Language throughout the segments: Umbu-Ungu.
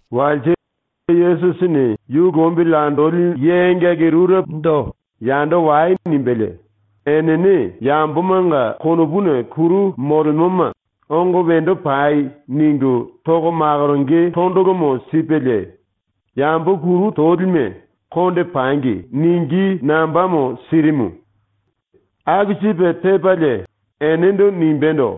Walse Yesusini yu lombili andoli ye engaki rurepondo “Yando wai.” nimbelie, enene yambomanga konopuna kuru molemoma “Ongo wendo pai.” ningu toko makoronge tondolomo sipelie, yambo kuru tolime ‘Konde pangi.’ ningí nambamo sirimu. Aku sipe tepalie enendo nimbendo: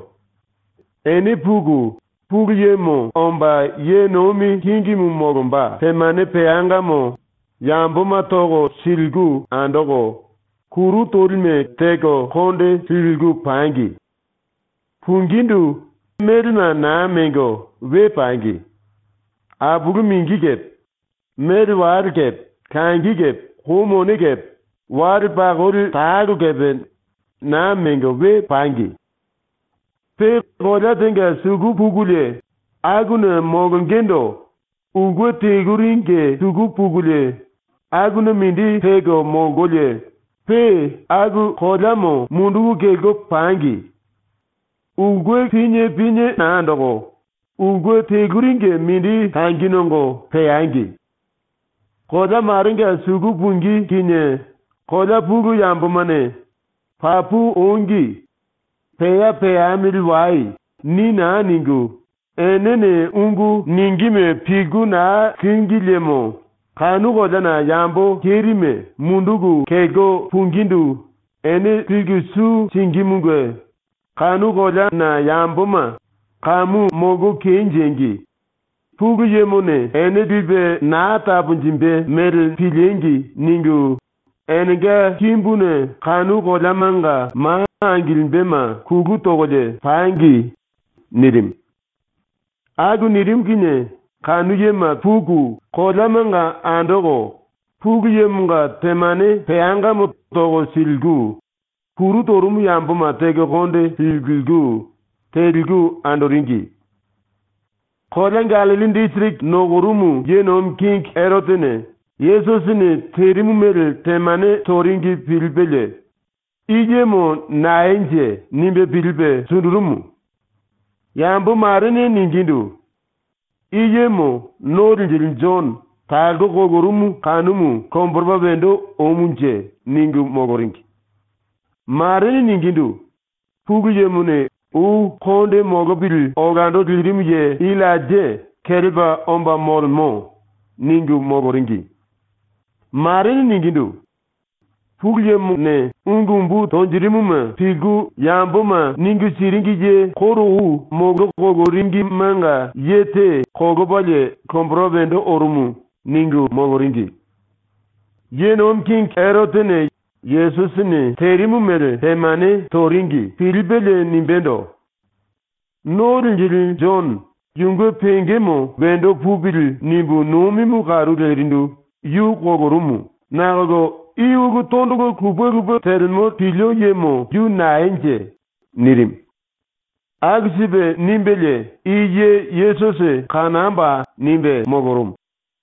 “Ene puku, Pulu Yemo omba ye nomi kingimu molomba temane peangamo yamboma toko siliku andoko, kuru tolime teko konde liliku pangi. “Pungindu, ene melema naa mengo we pangi. Apulu mingi kepe, mele wale kepe, langi kepe, kou mone kepe, wale pakoli talo kepe naa mengo we pangi. “Pe kolea tenga suku pukulie akuna molongendo ulke teluringe suku pukulie akuna mindi peko molkolie pe aku koleamo munduku kelko pangi. ⸤Ulke pinie pinie naa andoko, ulke teluringe mindi langi nongo peangi.⸥ Kolea marenga suku pungí kinie kolea pulu yambomane “Papu ongi. Pea peamili wai.” ni naa ningu enene ungu ningíme pilku naa língi liemo kanu koleana yambo kerime munduku kelko pungindu ene liku su singímunge kanu koleana yamboma ‘Kamu molko kenjengi! Pulu Yemone ene lipe naa taponjimbe mele piliengi!’ ningu enenga kimbuna kanu koleamanga ma angilimbema kulu tokolie pangi.” nirimu. Aku nirimu kinie kanu yema puku, koleamanga andoko, Pulu Yemonga temane peangamo toko siliku, kuru torumu yamboma teko konde liliku, teliku andoringi. Kolea Gallilli disiriki nokorumu ye nomi kingi Erotene Yesusini terimu mele temane toringi pilipelie, ‘I yemo naenje?’ nimbe pilipe sundurumu. Yambo marene ningindu: “I yemo ⸤No Linjili⸥ Jono ⸤talko kolorumu kanumu⸥ lomboropa wendo omunje.” ningu moloringi. Marene ningindu: “⸤Pulu Yemone ou konde molopili olando lirimu ye⸥ Illainja kelepa omba molemo.” ningu moloringi. Marene ningindu: “Pulu Yemone ungu umbu tonjirimuma pilku yamboma ningu siringi ye koro ou moloringimenga ye te kolopalie lomboropa wendo orumu.” ningu moloringi. ⸤Ye nomi kingi⸥ Erotene ⸤Yesusini terimu mele temane toringi⸥ pilipelie nimbendo: “⸤No Linjili⸥ Jono ‘yunge pengemo wendo pupili.’ nimbu nomimu karu lerindu yu kolorumu nakolo i ulu tondolo lupe lupe telemo pilio yemo yu naenje?” nirimu. Aku sipe nimbelie “I ye Yesusi kanamboa!” nimbe molorumu.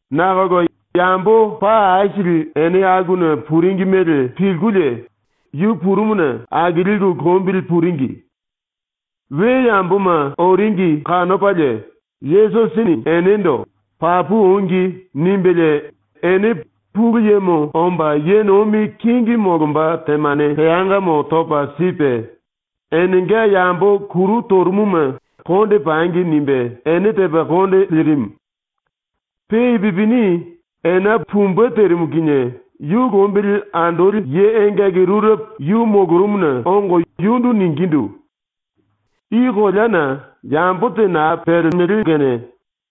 Nakolo yambo paa aisili ene akuna puringi mele pilkulie yu purumuna akilku lombili puringi. We yamboma oringi kanopalie Yesusini enendo “Papu ongi.” nimbelie ene Pulu Yemo omba ye nomi kingi molomba temane peangamo topa sipe, enenga yambo kuru torumuma ‘Konde pangi.’ nimbe ene tepa konde lirimu. Pe ipupini ena pumbe terimu kinie yu lombili andoli ye engaki rurepo yu molorumuna ongo yundu ningindu: “I koleana yambo te naa pelemo kene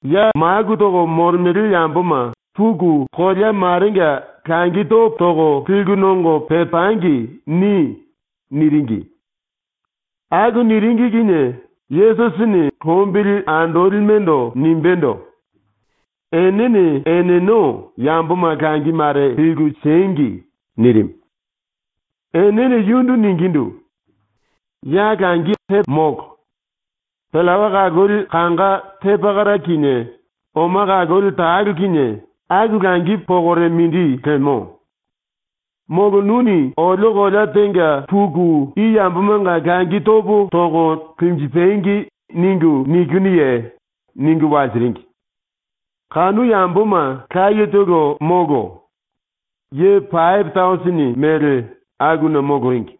ya maku toko molemele yamboma ‘Puku kolea marenga langi topo toko liku nongo pepangi.’ ni.” niringi. Aku niringi kinie Yesusini lombili andolimendo nimbendo: “Enene eneno yamboma langi mare liku siengi.” nirimu. Enene yundu ningindu: “Ya langi aisili molo. Pillawa kaloli kanga te pakara kinie oma kaloli talo kinie, aku langi pokore mindi lemo. Molo nuni ‘Olio kolea tenga puku i yambomanga langi topo toko linjipangi.’ ningu nikinuye?” ningu walsiringi. (Kanu yamboma layetolo molo, ye pape tausini mele akuna moloringi.)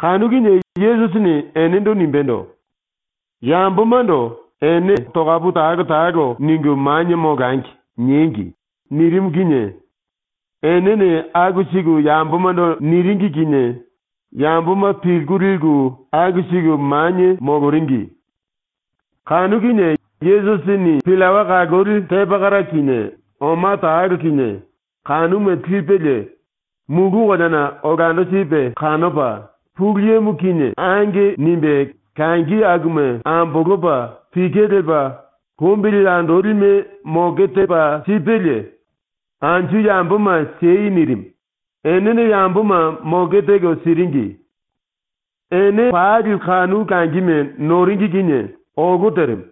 Kanu kinie Yesusini enendo nimbendo: “Yambomando ‘ene tokapu talo talo ningu manie molangi.’ niengi.” nirimu kinie enene aku siku yambomando niringi kinie yamboma pilku liku aku siku manie moloringi. Kanu kinie Yesusini pillawa kaloli te pakara kinie oma talo kinie kanuma lipelie mulu koleana olando sipe kanopa ⸤Pulu Yemo kinie⸥ “Ange.” nimbe langi akuma ambolopa pike lepa lombili andolime moke tepa sipelie “Anju yamboma siei.” nirimu, ⸤enene yamboma moke teko siringi⸥. Ene pali kanu langime noringi kinie olo terimu.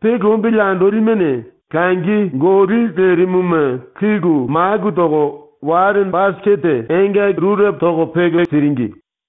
Pe lombili andolimene langi goli lerimuma liku maku toko wale basikete engaki rurepo toko peke siringi.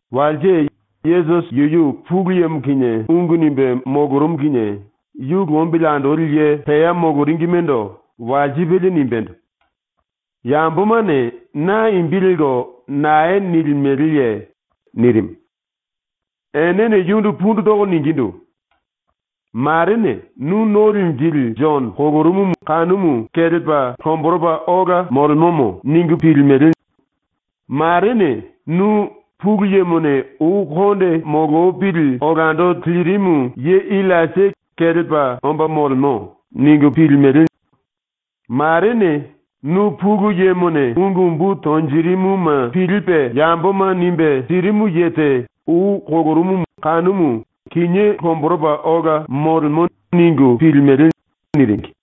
Walse, Yesusi yuyu Pulu Yemo kinie ungu nimbe molorumu kinie yu lombili andoli ye pea moloringimendo walsipelie nimbendo: “Yambomane na imbi lelko nae nilimeleye?” nirimu. Enene yundu pundu toko ningindu: “Marene “Nu No Linjili Jono ⸤kolorumumu kinié kelepa lomboropa ola molemomo⸥.” ningu pilku, marene “Nu, ⸤Pulu Yemone ou konde molopili olando lirimu ye⸥ Illainja kelepa omba molemo.” ningu pilku, marene “Nu Pulu Yemone ungu umbu tonjirimuma pilipe yamboma nimbe sirimu ye te ou kolorumumu kinié lomboropa ola molemo.” ningu pilimele.” niringi.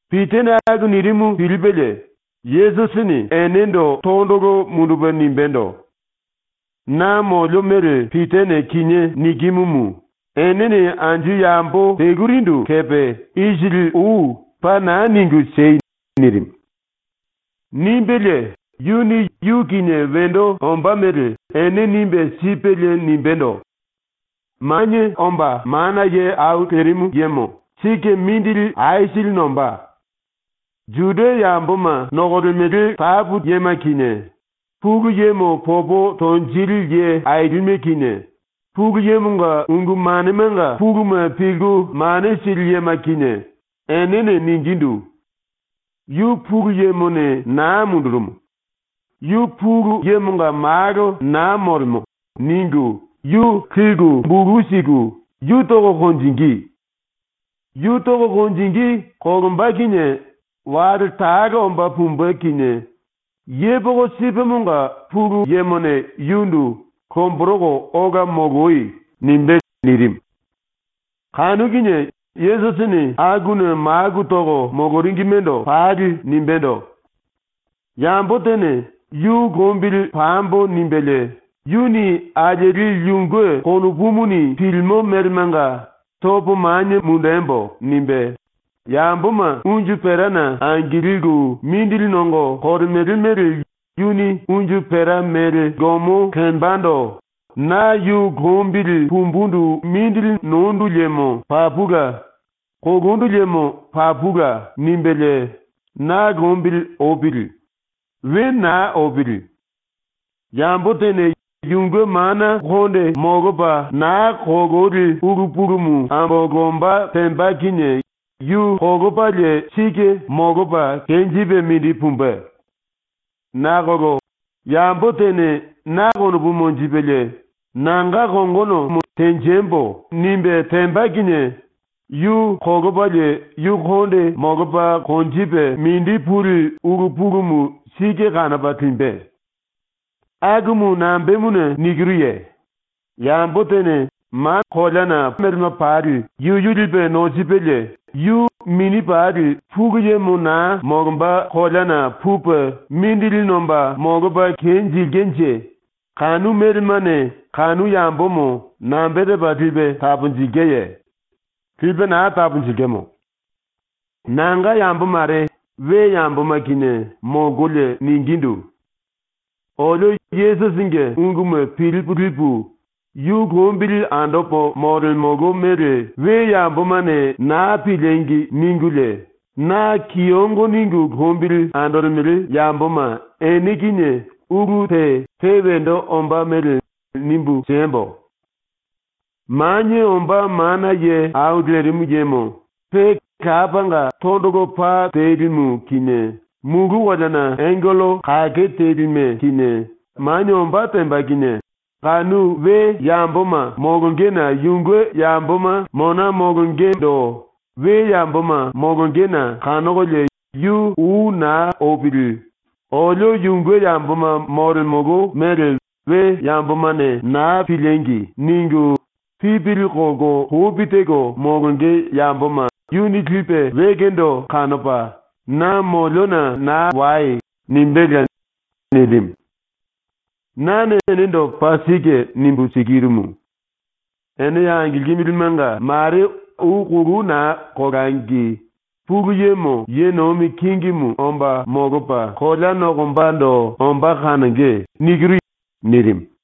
Pitane aku nirimu pilipelie Yesusini enendo tondolo mundupe nimbendo: “Na molio mele ⸤Pitane kinié nikimumu⸥ enene anju yambo telurindu kepe ⸤isili ou⸥ paa naa ningu siei.” nirimu. ⸤Nimbelie⸥ yuni ⸤yu kinie wendo ombá mele⸥ ene nimbe sipelie nimbendo: “Manie Omba Mana Ye Au Lerimu Yemo sike mindili aisili nombá. Juda yamboma nokolemele tapu yema kinie, Pulu Yemo popo tonjili ye ailime kinie, Pulu Yemonga ungu manemanga puluma pilku mane sili yema kinie, enene ⸤ningindu: “Yu Pulu Yemone naa mundurumu. Yu Pulu Yemonga Malo naa molemo.” ningu⸥ yu liku bulu siku yu toko konjingí. Yu toko konjingí kolomba kinie wale talo omba pumbe kinie yepoko sipemonga Pulu Yemone yundu ‘Lomboroko ola moloi.’ nimbé.” nirimu. Kanu kinie Yesusini akuna maku toko moloringimendo pali nimbendo: “Yambo tene ‘Yu lombili pambo.’ nimbelie yuni alieli yunge konopumuni pilimo melemanga ‘Topo manie mundembo.’ nimbe, yamboma unju perana angilku mindili nongo kolemele mele yuni unju pera mele gomo lembando ‘Na yu lombili pumbundu mindili nondu liemo papula; kolondu liemo papula.’ nimbelie na lombili opili. We naa opili. Yambo tene yunge mana molopa naa kololi ulu pulumu ambolomba temba kinie yu kolopalie sike molopa kenjipe mindi pumbe. Nakolo yambo tene na konopu monjipelie nanga kongono “Tenjembo.” nimbe temba kinie yu kolopalie yu konde molopa konjipe mindi puli ulu pulumu sike kanopa limbe. ⸤Akumu nambemuna nikiruye?⸥ Yambo tene mana melema pali yuyu lipe nosipelie yu mini pali Pulu Yemo naa molomba koleana pupe mindili nomba molopa kenjilkenje kanu melemane kanu yambomo nambe tepa lipe taponjilkenje? Lipe naa taponjilkemo. “Nanga yambo mare we yamboma kinie molkolie ningindu: “Olio Yesusinge unguma pilipu lipu, yu lombili andopo molemolo mele we yambomane naa piliengi!” ningulie, na kiyongo ningu lombili andolemele yamboma ene kinie ulu te pe wendo ombá mele nimbu siembo: Manie Omba Mana Ye Au Lerimu Yemo pe Lapanga tondolo pa telimu kinie ⸤mulu koleana⸥ angello kake telime kinie ⸤manie⸥ ombá temba kinie, kanu we yamboma molongena yunge yamboma mona molongendo we yamboma molongena kanokolie yu ou naa opili ‘Olio yunge yamboma molemolo mele we yambomane naa piliengi!’ ningu pipili kolko lopi teko molonge yamboma yuni lipe wekendo kanopa, “Na moliona naa wai.” nimbéla.” ⸤nirimu.⸥ “Nane enendo paa sike nimbu sikirumu: Ene ya angilkimilimenga mare ou kolou naa kolangi Pulu Yemo ye nomi kingimu omba molopa kolea nokombando ombá kanonge.” nirimu.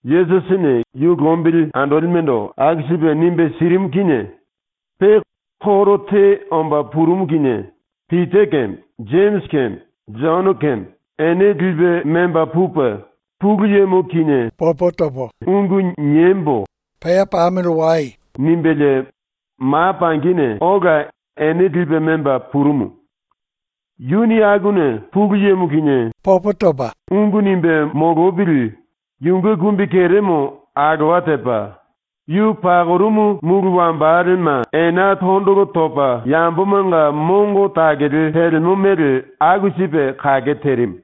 Yesusini ⸤yu lombili andolimendo aku sipe nimbe sirimu kinie⸥ pe koro te omba purumu kinie Pita keme, Jemisi keme, Jono keme, ene lipe memba pupe ‘Pulu Yemo kinie ungu niembo.’ nimbelie ma pangine ola ene lipe memba purumu. Yuni akuna Pulu Yemo kinie ungu nimbe molopili yunge kumbikeremo alowa tepa, yu pakorumu mulu wambalema ena tondolo topa yambomanga mongo takele telemo mele aku sipe kake terimu.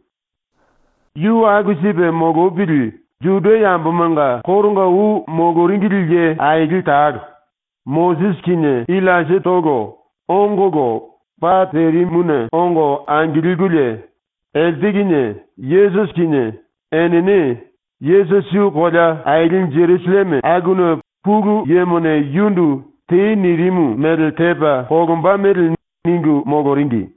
Yu aku sipe molopili, ⸤Juda yambomanga koronga ou moloringili ye aili talo,⸥ Mosisi kinie Illainjatolo, ongolo pa terimuna ongo angilkululie elte kinie Yesusi kinie enene Yesusi yu kolea aili Jerusalleme akuna Pulu Yemone yundu ‘Tei.’ nirimu mele tepa kolomba mele ningu moloringi.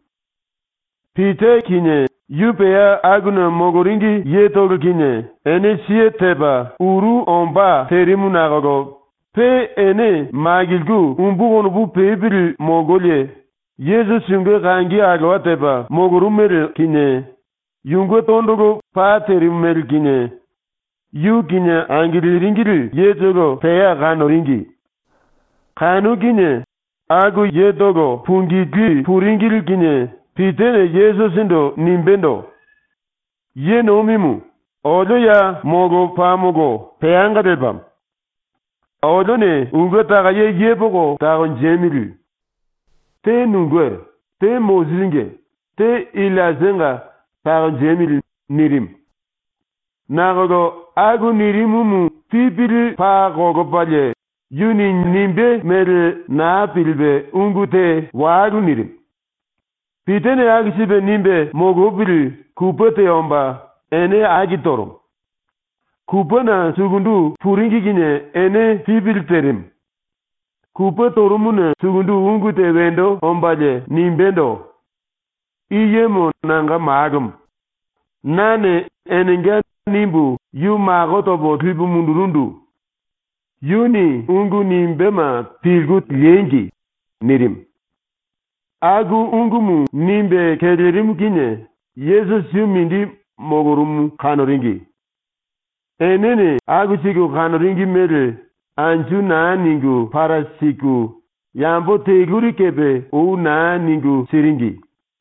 Pita kinie, yu pea akuna moloringi yetolo kinie, ene siye tepa uru ombá terimu nakolo pe ene makilku umbu konopu pepili molkolie Yesusi yunge kangi alowa tepa molorumu mele kinie, yunge tondolo pa terimu mele kinie, yu kinie angiliringili yetolo pea kanoringi. Kanu kinie aku yetolo pungilí puringili kinie Pitane Yesusindu nimbendo: “Ye Nomimu, olio ya molopamolo peanga lepamo. Olione ulke takaye yepoko takonjemili. Te nunge, te Mosisinge, te Illainjanga takonjemili.” nirimu. (Nakolo aku nirimumu ⸤pipili paa kolopalie⸥ yuni nimbé mele naa pilipe ungu te walu nirimu.) Pitane aku sipe nimbe molopili kupe te omba ene aki torumu. Kupena sukundu puringi kinie ene pipili terimu. Kupe torumuna sukundu ungu te wendo ombalie nimbéndo: “I yemo nanga Malomo. Nane ⸤‘Enenga’ nimbu⸥ yu mako topo lipu mundurundu. Yuni ungu nimbéma pilku liengi.” nirimu. Aku ungumu nimbe kelerimu kinie Yesusi yu mindi molorumu kanoringi. Enene aku siku kanoringi mele anju naa ningu para siku, yambo teluri kepe ou naa ningu siringi.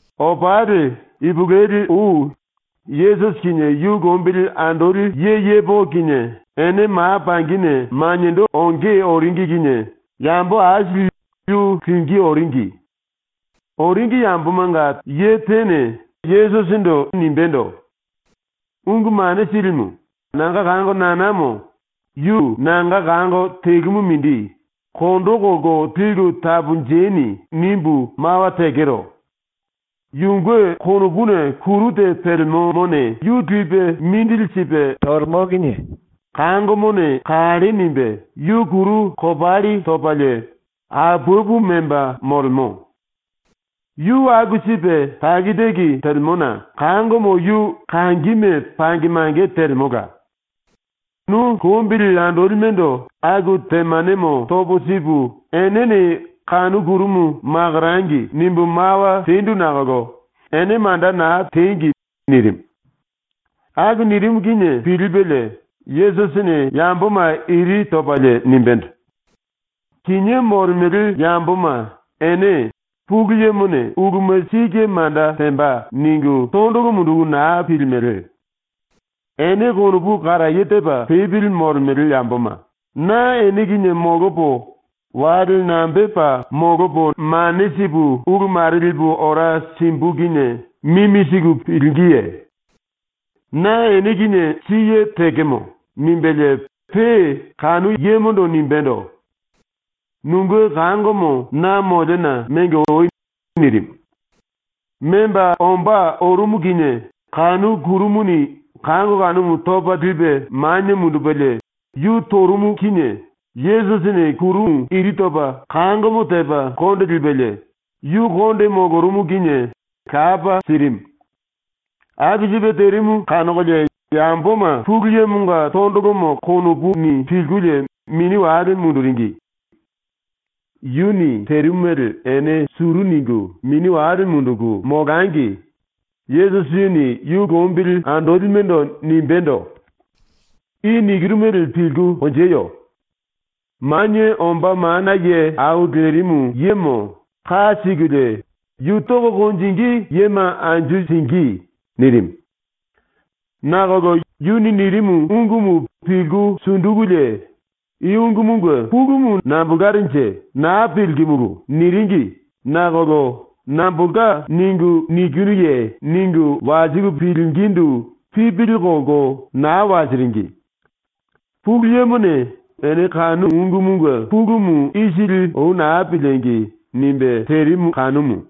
Opali, ipulueli ou ⸤Yesusi kinie yu lombili andoli ye yepoko kinie⸥ ene ma pangine maniendo onge oringi kinie yambo aisili yu lingí oringi. Oringi yambomanga ye tene Yesusindu nimbendo: “Ungu Mane Silimu, ‘Nanga kango nanamo, yu nanga kango telumu mindi, kondo kolko liku taponjeni.’ nimbu mawa tekero. Yunge konopuna kuru te pelemomone yu lipe mindili sipe tolemo kinie kangomone kalle nimbe, yu kuru kopalli topalie apapu memba molemo. Yu aku sipe taki taki telemona kangomo yu kangime pange mange telemola. Nu lombili andolimendo aku temanemo topo sipu enene kanu kurumu ‘Makorangi.’ nimbu mawa tendu nakolo ene manda naa tengi.” nirimu. ⸤Aku nirimu kinie⸥ pilipelie Yesusini ⸤yamboma iri topalie⸥ nimbendo: “Kinié molemele yamboma ene ⸤‘Pulu Yemone uluma sike manda temba.’ ningu⸥ tondolo munduku naa pilimele. Ene konopu karaye tepa pepili molemele yamboma, na ene kinie molopo, wale nambepa molopo mane sipu ulu mare lipu ora simbu kinie mimi siku pilingíye? ⸤Na ene kinie siye tekemo.⸥” nimbelie pe kanu yemondo nimbendo: “Nunge kangomo na moliona mengo oi.” nirimu. Memba ombá orumu kinie kanu kurumuni kango kanumu topa lipe manie mundupelie yu torumu kinie Yesusini kurumu iri topa kangomo tepa konde lipelie, yu konde molorumu kinie lapa sirimu. Aku sipe terimu kanokolie yamboma Pulu Yemonga tondolomo konopuni pilkulie mini wale munduringi. Yuni terimu mele ene suru ningu mini wale munduku molangi Yesusini yu lombili andolimendo nimbendo: “I nikiru mele pilku konjeyo. Manie Omba Mana Ye Au Lerimu Yemo ⸤ka sikulie yu tonge⸥ yema anju singí.” nirimu. Nakolo yuni nirimu ungumu pilku sundukulie ‘I ungumunge pulumu nambolkarenje, naa pilkimulu.’ niringi nakolo “Nambolka ningu nikinuye?” ningu walsiku pilingindu pipili kolko naa walsiringi. Pulu Yemone ‘Ene kanu ungumunge pulumu isili ou naa piliengi!’ nimbe terimu kanumu.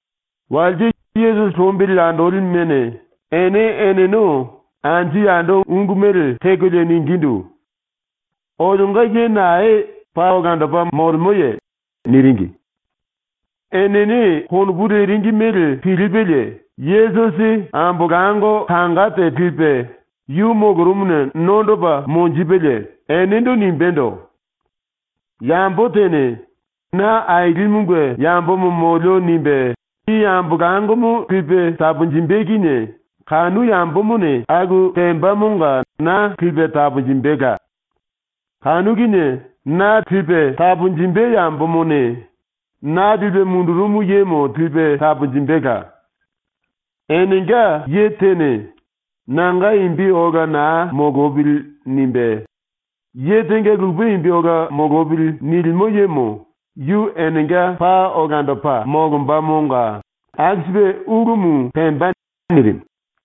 ⸤Walse Yesusi lombili andolimene⸥ ene eneno anju yando ungu mele tekolie ningindu: “Olionga ye nae paa olandopa molemoye?” niringi. Enene konopu leringi mele pilipelie, Yesusi ambolango kanga te lipe yu molorumuna nondopa monjipelie enendo nimbendo: “Yambo tene ‘Na Ailimunge yambomo molio.’ nimbe i ambolangomo lipe taponjimbe kinie kanu yambomone aku tembamonga na lipe taponjimbela. Kanu kinie na lipe taponjimbe yambomone na lipe mundurumu yemo lipe taponjimbela. Enenga ye tene ‘Nanga imbi ola naa molopili.’ nimbe, ‘Ye tenga lupe imbi ola molopili.’ nilimo yemo yu enenga paa olandopa molombamonga ⸤aku sipe ulumu pemba⸥.” nirimu.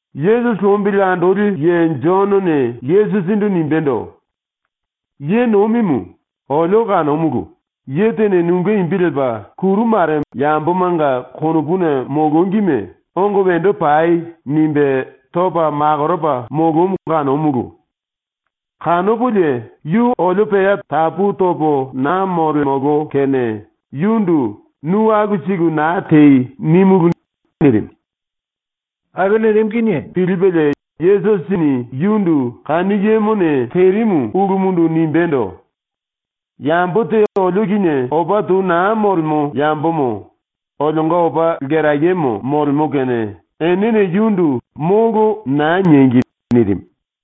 Yesusi lombili andoli ye Jonone Yesusindu nimbendo: “Ye Nomimu, olio kanomulu, ye tene nunge imbi lepa kuru mare yambomanga konopuna molongime “Ongo wendo pai.” nimbe topa makoropa molomu kanomulu. Kanopolie yu olio pea tapu topo naa molemolo kene yundu “Nu aku siku naa tei.” nímulu.” nirimu. Aku nirimu kinie pilipelie Yesusini yundu ⸤kanu yemone terimu ulumundu⸥ nimbendo: “Yambo te olio kinie opa tou naa molemo yambomo olionga opa lkerayemo molemo kene enene yundu “Molo.” naa niengi.” nirimu.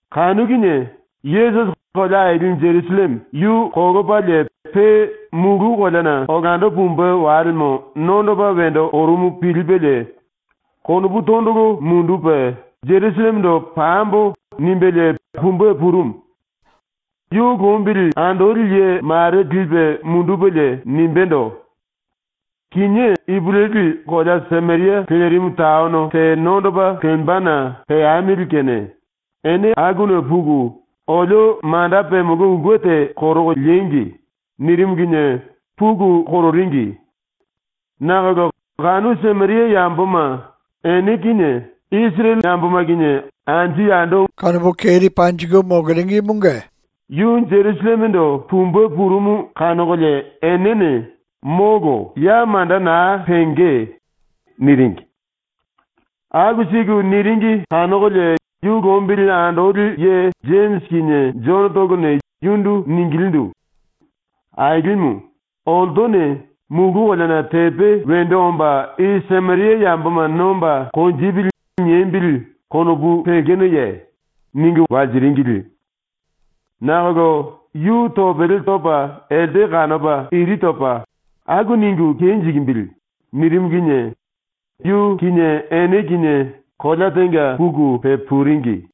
Kanu kinie Yesusi kolea aili Jerusalleme yu kolopalie pe mulu koleana olando pumbe walemo nondopa wendo orumu pilipelie konopu tondolo mundupe ‘Jerusallemendo pambo.’ nimbelie pumbe purumu. Yu lombili andoli ye mare lipe mundupelie nimbendo: “Kinié ipulueli kolea Sameria lerimu taono te nondopa lembana peamili kene ene akuna puku olio manda pemolo ulke te koroko liengi.” nirimu kinie puku kororingi. Nakolo kanu Sameria yamboma ⸤ene kinie Isirele yamboma kinie opa tou molkolie⸥ yu Jerusallemendo pumbe purumu kanokolie enene “Molo, ya manda naa penge.” niringi. Aku siku niringi kanokolie yu lombili andoli ye Jemisi kinie Jonotolone yundu ningilindu: “Ailimu, ‘oltone ‘Mulu koleana tepe wendo omba i Sameria yamboma nomba konjipili.’ niembili.’ konopu lekenoye?” ningu walsiringili. Nakolo yu topele topa elte kanopa iri topa “Aku ningu kenjikimbili.” nirimu kinie yu kinie ene kinie kolea tenga puku pepuringi.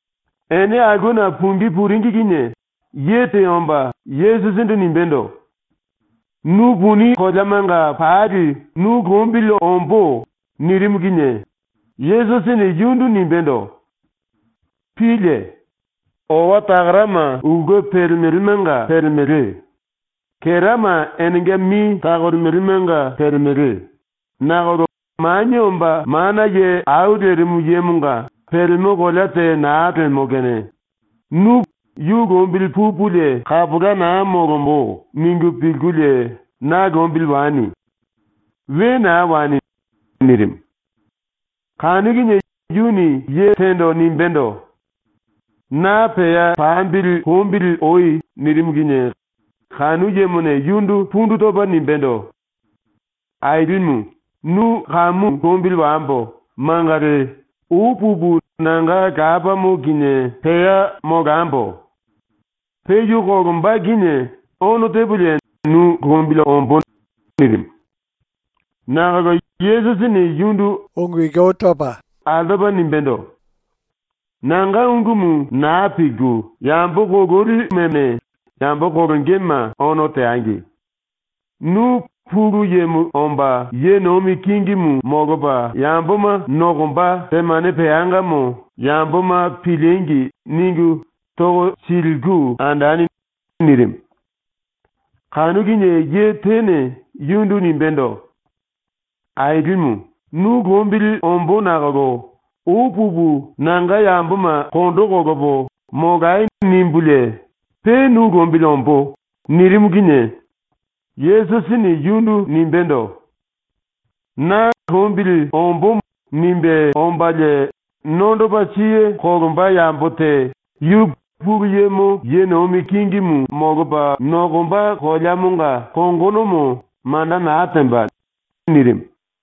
Ene aulkena pungí puringi kinie ye te omba Yesusindu nimbendo: “Nu puni koleamanga pali nu lombili ombó.” nirimu kinie Yesusini yundu nimbendo: “Pílie! Owa takarama ulke pelemelemanga pelemele; kerama enenga mi takolemelemanga pelemele; nakolo Manie Omba Mana Ye Au Lerimu Yemonga pelemo kolea te naa lemo ⸤kene, nu ‘Yu lombili pupulie kapola naa molombo.’ ningu pilkulie na lombili wani. We naa wani.⸥” nirimu. Kanu kinie yuni ye tendo nimbendo: “Na pea pambili lombili oi.” nirimu kinie kanu yemone yundu pundu topa nimbendo: “Ailimu, ⸤nu kamu lombili wambo mangali⸥ ou pupu nanga lapamo kinie pea molambo. Pe yu kolomba kinie ono tepolie nu lombili ombó.” nirimu. Nakolo Yesusini yundu altopa nimbendo: “⸤Nanga ungumu naa pilku⸥ yambo kololi ⸤none teli⸥ yambomane yambo kolongema ono teangi. Nu ‘Pulu Yemo omba ye nomi kingimu molopa yamboma nokomba temane peangamo yamboma piliengi!’ ningu toko siliku andani.” nirimu. Kanu kinie ye tene yundu nimbendo: “Ailimu, nu lombili ombó nakolo ou pupu nanga yamboma kondo kolopo ‘Molai.’ nimbulie pe nu lombili ombó.” nirimu kinie Yesusini yundu nimbendo: “Na ‘Lombili ombómo.’ nimbe ombalie nondopa siye kolomba yambo te yu Pulu Yemo ye nomi kingi molopa nokomba koleamonga kongonomo manda naa temba.” nirimu.